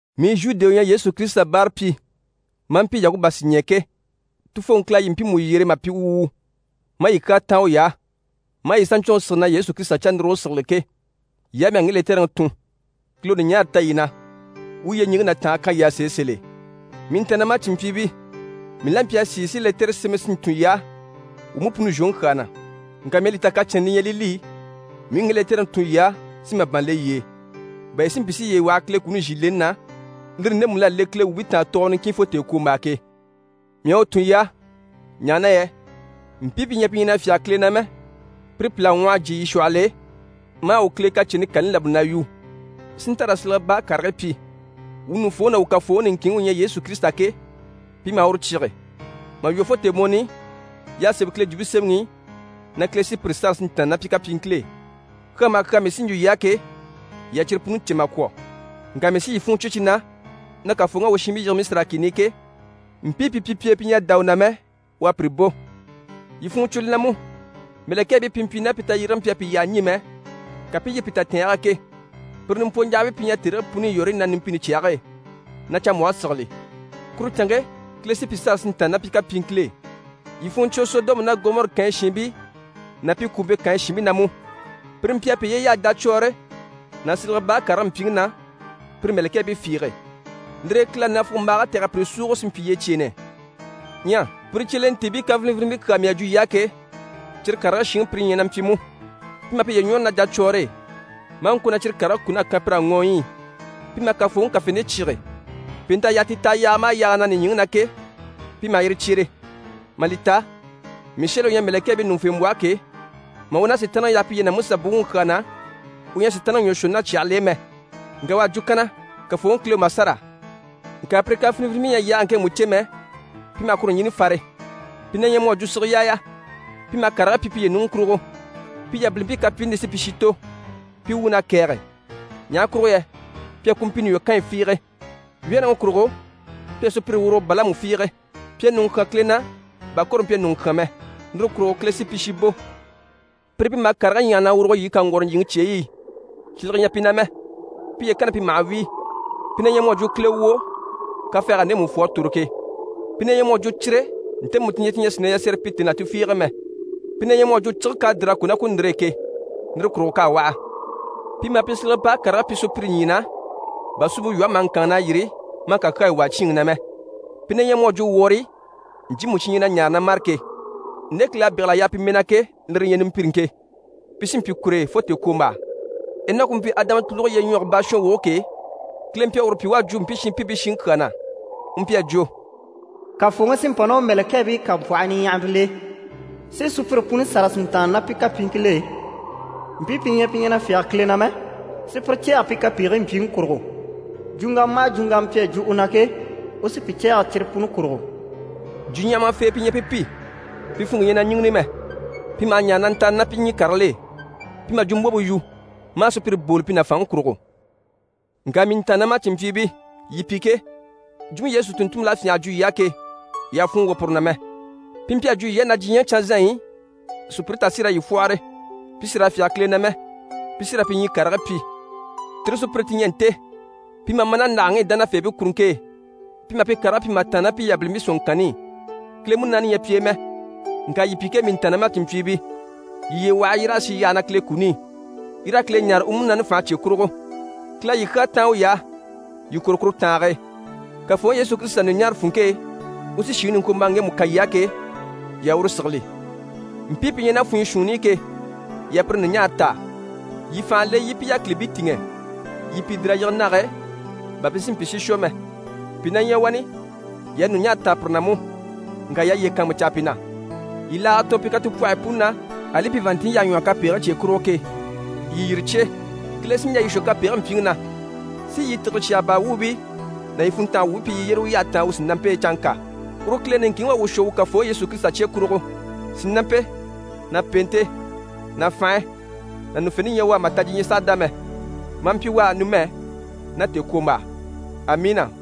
Mii Zhude u ɲyɛ Yesu Kirisita báarapyi, maa mpyi Yakuba sìɲɛɛ ke, Tufooŋi Kile à yii mpiimu yyere mà pyi u wuu, maa yii kyaa táan uy'á, maa yii saɲcwɔnŋi sigili na Yesu Kirisita cannuruge sigili ke, yii á mii à ŋge lɛtɛrɛŋi tun. Kile u ɲùɲaara ta yii na, u u yyeɲiŋke ná tàange kan yii á sèe sèl'e. Mii ntàannamacinmpyiibii, mii la mpyi a sìi si lɛtɛrɛ sémɛ si ntun yii á wuu mú puni zhwoŋi kyaa na. Ŋka mii à li ta kacɛnnɛ li ɲyɛ li li mii u ŋge lɛtɛrɛŋi tun yii á si màban le yii e, bà yii si mpyi si yiye waha Kile kuni zhì leni na, lire ndemu l'à le Kile wuubii taan tɔɔgɔ niŋkin fo tèekwombaa ke. Mii à u tun yii á, ɲaha na yɛ mpii pi ɲyɛ pi ɲyɛ na fyáge Kile na mɛ, pire pìl'à ŋwɔh'a jyè yii shwɔhɔl'e, maa wuu Kile kacɛnni kani labali na yu, si nta raa silege baa karigii pyi. Wuu ɲùŋufooŋi ná wuu Kafooŋi niŋkinŋi u ɲyɛ Yesu Kirisita ke, pi maha uru cyíge. Mà lwɔ́ fo tèemɔni i y'à sémɛ Kile Jwumpe Semɛŋi i na Kile sí pire sâra si ntàanna ná pi kapyiŋkil'e. Kyaa maha kyaa mii sí n‑jwo yii á ke, yii à cyire puni cè mà kwɔ̀, ŋka mii sí yii funŋɔ cwo cyi na na Kafooŋi à u shiinbii yige Misira kìni i ke, mpii pi mpyi pi e pi ɲyɛ a dá u na mɛ, u à pire bò. Yii funŋɔ cwo li na mú, mɛ̀lɛkɛɛbii pi mpyi ná pi tayyérege mpyi a pi yyaha ɲî mɛ, ka pi i yîri pi tatɛɛnge e ke, pire nimpwɔɲjahabii pi ɲyɛ tèrigii puni i yɔ̀rɔyi na numpini cyage e, na canmbwɔhe sigili, kuru canŋke Kile sí pi sâra si ntàanna ná pi kapyiŋkil'e. Yii funŋɔ cwo Sɔdɔmu ná Gɔmɔri kànyi shiinbii ná pi kwùumpe kànyi shiinbii na mú. Pire mpyi a piye yaha jacwɔɔre ná silege baa karigii mpyiŋi na pire mɛ̀lɛkɛɛbii fiige. Lire e Kile à nafugombaage tɛ̀g'a pire súugo si mpyi yyecyeenɛ. Ɲyɛ pire cyelentiibii kafinivinibii kyaa mii à jwo ke, cyire karigii shiŋi pire ɲyɛ na mpyi mú: pi maha piye ɲwɔ́re ná jacwɔɔre e, maa ŋko na cyire karigii kun'à kan pir'á ŋɔɔyi i, pi maha Kafooŋi kafente cyíge, pèent'à yaa ti taha yaaga maha yaaga na nìɲyiŋi na ke, pi maha yire cyere. Mà li ta Mishɛli u ɲyɛ mɛ̀lɛkɛɛbii ɲùŋufembwɔhɔ ke, mà u ná Sitaanniŋi yaha piye na Musa buwuŋi kyaa na, u ɲyɛ a Sitaanniŋi ɲwɔ shwɔ ná cyàhigil'e mɛ, ŋka u à jwo kanna: «Kafooŋi Kile u ma sâra.» Ŋka pire kafinivinibii ɲyɛ a yaage ŋkemu cè mɛ, pi maha kuru ɲjini fare, pi na ɲyɛ mu à jwo sige yaaya. Pi maha karigii pyi piye ɲùŋɔ kurugo, pi yabilimpii kapyiini li sí pi shi tò. Pi wuun'à kɛ̀ɛge, ɲaha kurugo yɛ pi à kumpiini lwɔ́ Kanɲi fiige. Wyɛ́rɛŋi kurugo pi à sùpyire wurugo Balamu fiige. Pi à ɲùŋɔ kyán Kile na, bà Kore mpyi a ɲùŋɔ kyán mɛ, lire kurugo Kile sí pi shi bò. Pire pi maha karigii ɲyaha na wùruge yii kaŋgwɔrɔ ɲjyìŋi cyeyi i, silege ɲyɛ pi na mɛ. Piye kanni pi maha wíi. Pi na ɲyɛ mu à jwo kilewwoo kafɛɛg'à ndemu fwɔ a tòro ke, pi na ɲyɛ mu à jwo cire ntemu ti ɲyɛ ti ɲyɛ a sìi na yasɛrɛ pyi tèni là tufiige e mɛ, pi na ɲyɛ mu à jwo cige k'à dìr'a kò ná ku ndìre e ke, lire kurugo k'à waha. Pi maha pi silege baa karigii pyi sùpyire ɲyii na, bà suumpe lwɔhe maha ŋkânŋi na yîri maa kakyayi yige na wàa cyíinŋi na mɛ. Pi na ɲyɛ mu à jwo wɔrii ɲcyiimu cyi ɲyɛ na ɲaare na mâre ke. Nde Kile à bégele pi mɛɛ na ke, lire li ɲyɛ nimpiriŋke, pi sí n‑pyi kur'e fo tèekwombaa. Enɔki u mpyi Adama tùluge lyeɲwɔge baashɔnwoge ke, Kile mpyi a uru pyi u à jwo mpii shinpiibii shiŋi kyaa na, u mpyi a jwo: «Kafooŋi sí n‑pa ná u mɛ̀lɛkɛɛbii kampwɔhii niɲyahaɲyahamil'e, si sùpyire puni sâra si ntàanna ná pi kapyiiŋkil'e, mpii pi ɲyɛ pi ɲyɛ na fyáge Kile na mɛ, si pire cɛ̂ɛgɛ pi kapegigii mpyiŋi kurugo. Jwuŋgama maha jwuŋgama pi à jwo u na ke, u sí pi cɛ̂ɛgɛ cyire puni kurugo.» Jwuɲyahamafee pi ɲyɛ pi pi, pi funŋke ɲyɛ na ɲíŋini mɛ, pi maha ɲaare na ntàanni ná pi ɲyii karigil'e, pi maha jwumbwompe yu, maa sùpyire booli pi nàfanŋi kurugo. Ŋka mii ntàannamacinmpyiibii, yii pi ke, jwumpe Yesu tùnntunmpil'à fyânha a jwo yii á ke, yii àha funŋɔ wwɔ̀ puru na mɛ. Pi mpyi a jwo yii á na diɲyɛŋi canzanɲyi i, sùpyire tà sí raa yii fwɔ́hɔre, pi sì raa fyáge Kile na mɛ, pi sí raa pi ɲyii karigii pyi. Tire sùpyire ti ɲyɛ nte, pi maha ma ná ndàhalaŋi i dánafeebii kuruŋke e, pi maha pi karigii pyi mà tàanna ná pi yabilimpii sɔ̀nŋɔŋkanni i. Kile Munaani ɲyɛ pi e mɛ. Ŋka yii pi ke, mii ntàannamacinmpyiibii, yii yiye waha yii raa sì yyaha na Kile kuni i, yii raa Kile ɲáare u Munaani fànhe cye kurugo. Kile à yii kyaa táan uy'á, yii kwôro kuru tàange e. Kafooŋi Yesu Kirisita ɲùɲaare funŋke e, u sí shìŋi niŋkwombaaŋi ŋgemu kan yii á ke, yii a uru sigili. Mpii pi ɲyɛ ná funyɔ shuunni i ke, yii a pire ɲùɲaare taa, yii fànha le, yii i pi yákilibii tìŋɛ. Yii i pìi dìr'a yige nage e bà pi si mpyi si shwɔ mɛ. Pìi na ɲyɛ wani, yii a ɲùɲaara taa pire na mú, ŋka yii a yiye kàanmucaa pi na, yii laaga tɔɔn pi katupwɔhɔyi puni na, ali pi vàanntinɲyi y'à ɲwɔ́hɔ kapegigii cye kurugo ke, yii yire cyé. Kile sí n‑jà yii shwɔ kapegigii mpyiŋi na, si yii tìgire cyaga baa wuubii ná yii funntanga wuubii pyi yii yyére u yyahe taan u sìnampe e canŋka. Uru Kile niŋkinŋi u à wuu shwɔ wuu Kafooŋi Yesu Kirisita cye kurugo. Sìnampe ná pèente ná fànhe ná ɲùŋufente ɲyɛ u á, mà ta diɲyɛŋi sàha dá mɛ, maa mpyi u á numɛ ná tèekwombaa. Amiina!